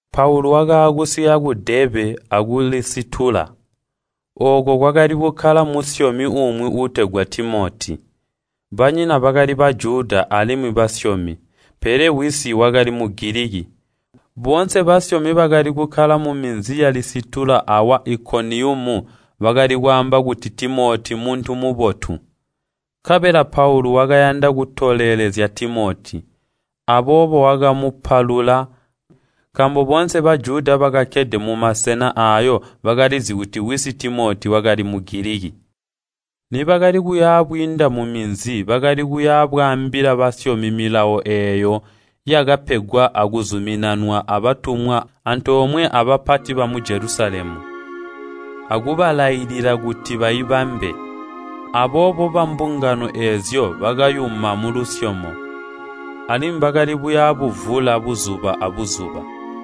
Paulu wakaakusika ku Deebe aku Lisitula. Ooko kwakali kukkala musyomi umwi uutegwa Timoti. Banyina bakali Bajuda alimwi basyomi. Pele wisi wakali Mugiliki. Boonse basyomi bakali kukkala muminzi ya Lisitula awa Ikoniyumu bakali kwaamba kuti Timoti mmuntu mubotu. Nkabela Paulu wakayanda kutolelezya Timoti. Aboobo wakamupalula nkaambo boonse Bajuda bakakkede mumasena aayo bakalizi kuti wisi Timoti wakali Mugiliki. Nibakali kuya bwiinda muminzi bakali kuya bwaambila basyomi milawo eeyo yakapegwa akuzuminanwa abatumwa antoomwe abapati mu Jelusalemu, akubalailila kuti baibambe. Aboobo bambungano eezyo bakayuma mulusyomo, alimwi bakali buya buvula buzuba abuzuba.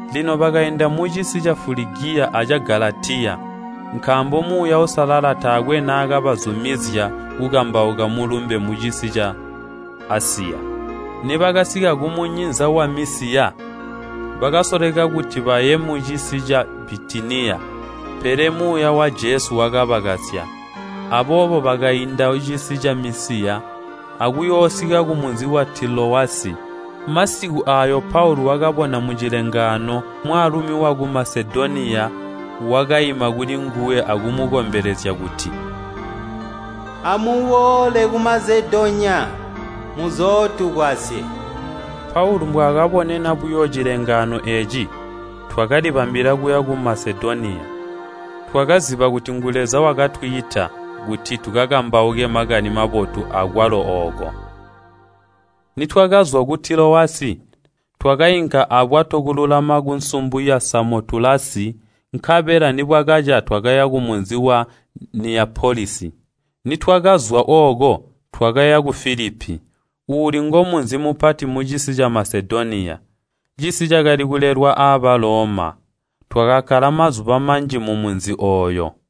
Lino bakainda mucisi ca Fuligiya aca Galatiya, nkaambo Muuya Uusalala taakwe naakabazumizya kukambauka Mulumbe mucisi ca Asiya. Nibakasika kumunyinza wa Misiya, bakasoleka kuti baye mucisi ca Bitiniya, pele Muuya wa Jesu wakabakasya. Aboobo bakainda cisi ca Misiya akuyoosika kumunzi wa Tilowasi. Masiku aayo Paulu wakabona mucilengaano, mwaalumi waku Masedoniya wakaima kuli nguwe akumukombelezya kuti, “Amuboole ku Masedoniya muzootugwasye!” Paulu mbwaakabonena buyo cilengaano eeci, twakalibambila kuya ku Masedoniya. Twakaziba kuti ngu Leza wakatwiita kuti tukakambauke Makani Mabotu akwalo ooko. Nitwakazwa ku Tilowasi, twakainka abwato kululama kunsumbu ya Samotulasi, nkabela nibwakaca twakaya kumunzi wa Niyapolisi. Nitwakazwa ooko twakaya ku Filipi, uuli ngomunzi mupati mucisi ca Masedoniya, cisi cakali kulelwa a Baloma. Twakakkala mazuba manji mumunzi ooyo.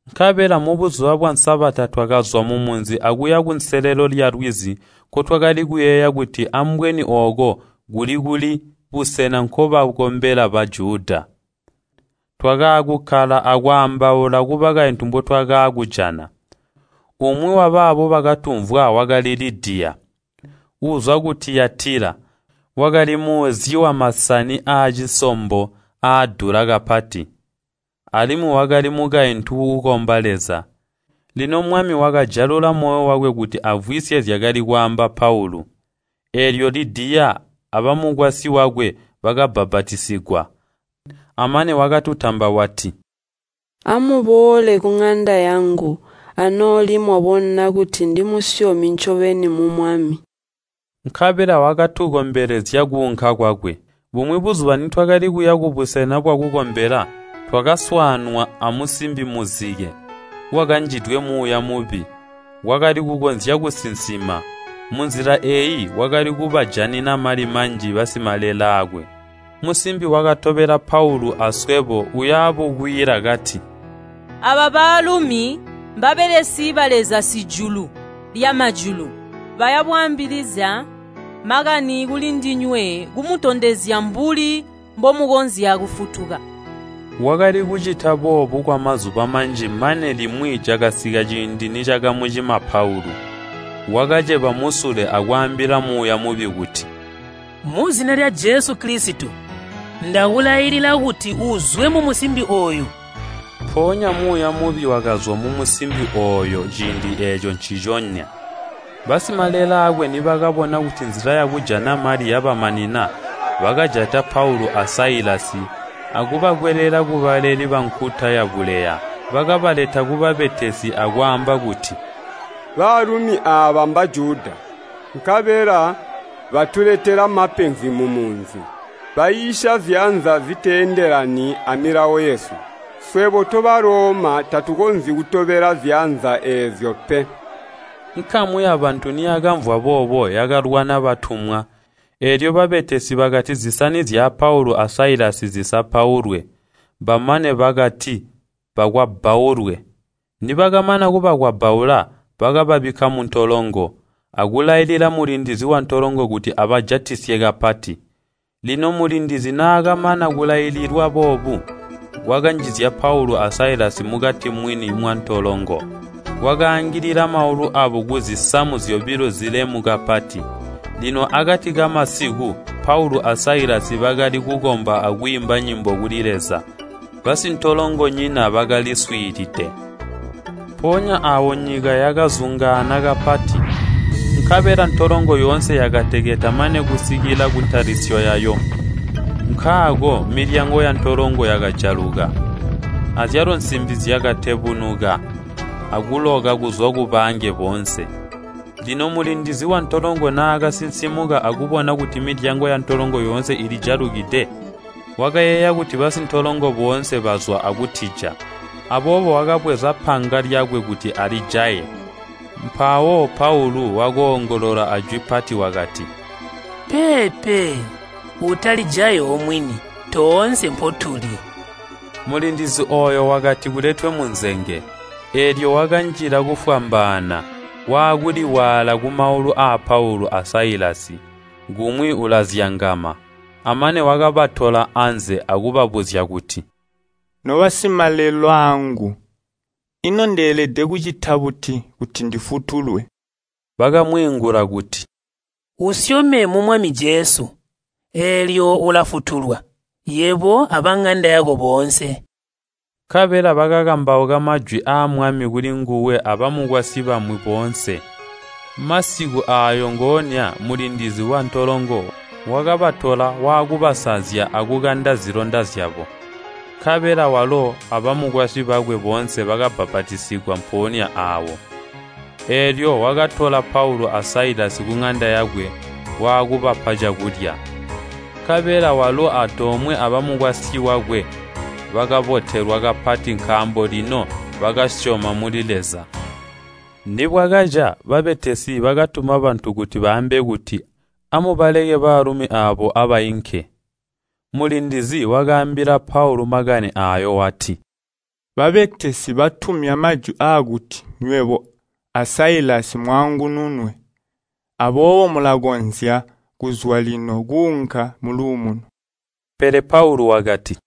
Nkabela mubuzuba bwa Sabata twakazwa mumunzi akuya kunselelo lyalwizi nkotwakali kuyeeya kuti ambweni ooko kuli-kuli busena nkobakombela Bajuda. Twakaakukkala akwaambaula kubakaintu mbotwakaakujana. Umwi wabaabo bakatumvwa wakali Lidiya, uuzwa ku Tiyatila. Wakali muuzyi wamasani aacisombo aadula kapati, alimwi wakali mukaintu uukomba Leza. Lino Mwami wakajalula moyo wakwe kuti amvwisye zyakali kwaamba Paulu. Eelyo Lidiya abamukwasyi wakwe bakabbapatizigwa. Amane wakatutamba wati, “Amuboole kuŋanda yangu anooli mwabona kuti ndimusyomi ncobeni mu Mwami.” Nkabela wakatukombelezya kuunka kwakwe. Bumwi buzuba nitwakali kuya kubusena bwakukombela, twakaswaanwa amusimbi muzike, wakanjidwe muuya mubi. Wakali kukonzya kusinsima. Munzila eeyi wakali kubajanina mali manji basimalelaakwe. Musimbi wakatobela Paulu aswebo, uya bukwiila kati, “Aaba baalumi mbabelesi ba Leza Sijulu lyamajulu! Baya bwaambilizya makani kulindinywe, kumutondezya mbuli mbomukonzya kufutuka!” Wakali kucita boobu kwamazuba manji mane limwi cakasika ciindi nicakamucima Paulu. Wakaceba musule akwaambila muuya mubi kuti, “Muzina lya Jesu Kilisito, ndakulailila kuti uzwe mumusimbi ooyu!” Mpoonya muuya mubi wakazwa mumusimbi ooyo ciindi eeco nciconya. Basimalelaakwe nibakabona kuti nzila yakujana mali yabamanina, bakajata Paulu a Sailasi akubakwelela kubaleli bankuta yabuleya. Bakabaleta kubabetesi akwaamba kuti, “Baalumi aaba Mbajuda, nkabela batuletela mapenzi mumunzi. Baiisya ziyanza ziteendelani amilawo yesu. Swebo to Baloma tatukonzyi kutobela ziyanza eezyo pe!” Nkamu yabantu niyakamvwa boobo yakalwana batumwa, eelyo babetesi bakati zisani zya Paulu a Sailasi zizapaulwe, bamane bakati bakwabbaulwe. Nibakamana kubakwabbaula, bakababikka muntolongo, akulailila mulindizi wantolongo kuti abajatisye kapati. Lino mulindizi naakamana kulaililwa boobu, wakanjizya Paulu a Sailasi mukati mwini mwantolongo. Wakaangilila maulu aabo kuzisamu zyobilo zilemu kapati. Lino akati kamasiku Paulu a Sailasi bakali kukomba akwiimba nyimbo kuli Leza, basintolongonyina bakaliswiilide. Mpoonya aawo nyika yakazungaana kapati, nkabela ntolongo yoonse yakateketa mane kusikila kuntalisyo yayo. Nkaako milyango yantolongo yakajaluka, azyalo nsimbi zyakatebunuka akuloka kuzwa kubaange boonse. Lino mulindizi wantolongo naakasinsimuka akubona kuti milyango yantolongo yoonse ilijalukide, wakayeeya kuti basintolongo boonse bazwa akutija. Aboobo wakabweza panga lyakwe kuti alijaye. Mpawo Paulu wakoongolola ajwi pati wakati, “Peepe! Utalijayi omwini. Toonse mpotuli!” Mulindizi ooyo wakati, “Kuletwe munzenge!” Eelyo wakanjila kufwambaana, waakuliwaala kumaulu aa Paulu a Sailasi, kumwi ulazyangama. Amane wakabatola anze akubabuzya kuti, “Nobasimalelaangu, ino ndeelede kucita buti kuti ndifutulwe?” Bakamwiingula kuti, “Usyome mu Mwami Jesu, eelyo ulafutulwa, yebo abaŋanda yako boonse.” Nkabela bakakambauka majwi aa Mwami kulinguwe abamukwasyi bamwi boonse. Masiku aayo ngoonya, mulindizi wantolongo, wakabatola waakubasanzya akukanda zilonda zyabo. Nkabela walo abamukwasyi wakwe boonse bakabbapatizigwa mpoonya aawo. Eelyo wakatola Paulu a Sailasi kuŋanda yakwe waakubapa cakulya. Nkabela walo antoomwe abamukwasyi wakwe bakabotelwa kapati nkaambo lino bakasyoma muli Leza. Nibwakaca, babetesi bakatuma bantu kuti baambe kuti, “Amubaleke baalumi aabo abainke.” Mulindizi wakaambila Paulu makani aayo wati, “Babetesi batumya majwi aakuti nywebo a Sailasi mwaangununwe. Aboobo mulakonzya kuzwa lino kuunka muluumuno.” Pele Paulu wakati,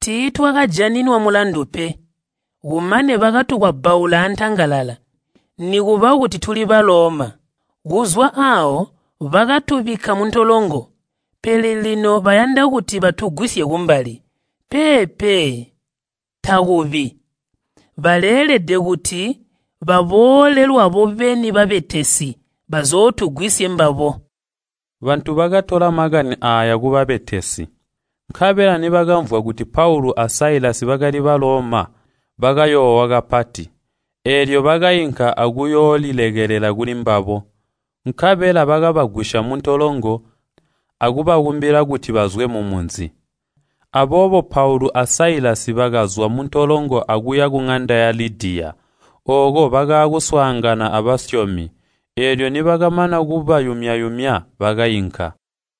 “Tiitwakajaninwa mulandu pe. Kumane bakatukwabbaula antangalala, nikuba kuti tuli Baloma! Kuzwa aawo bakatubikka muntolongo, pele lino bayanda kuti batugwisye kumbali! Peepe, takubi! Baleelede kuti baboole lwabo beni babetesi, bazootugwisye mbabo!” Bantu bakatola makani aaya kubabetesi. Nkabela nibakamvwa kuti Paulu a Sailasi bakali Baloma, bakayoowa kapati. Eelyo bakainka akuyoolilekelela kulimbabo, nkabela bakabagwisya muntolongo akubakumbila kuti bazwe mumunzi. Aboobo Paulu a Sailasi bakazwa muntolongo akuya kuŋanda ya Lidiya. Ooko bakaakuswaangana abasyomi, eelyo nibakamana kubayumya-yumya bakainka.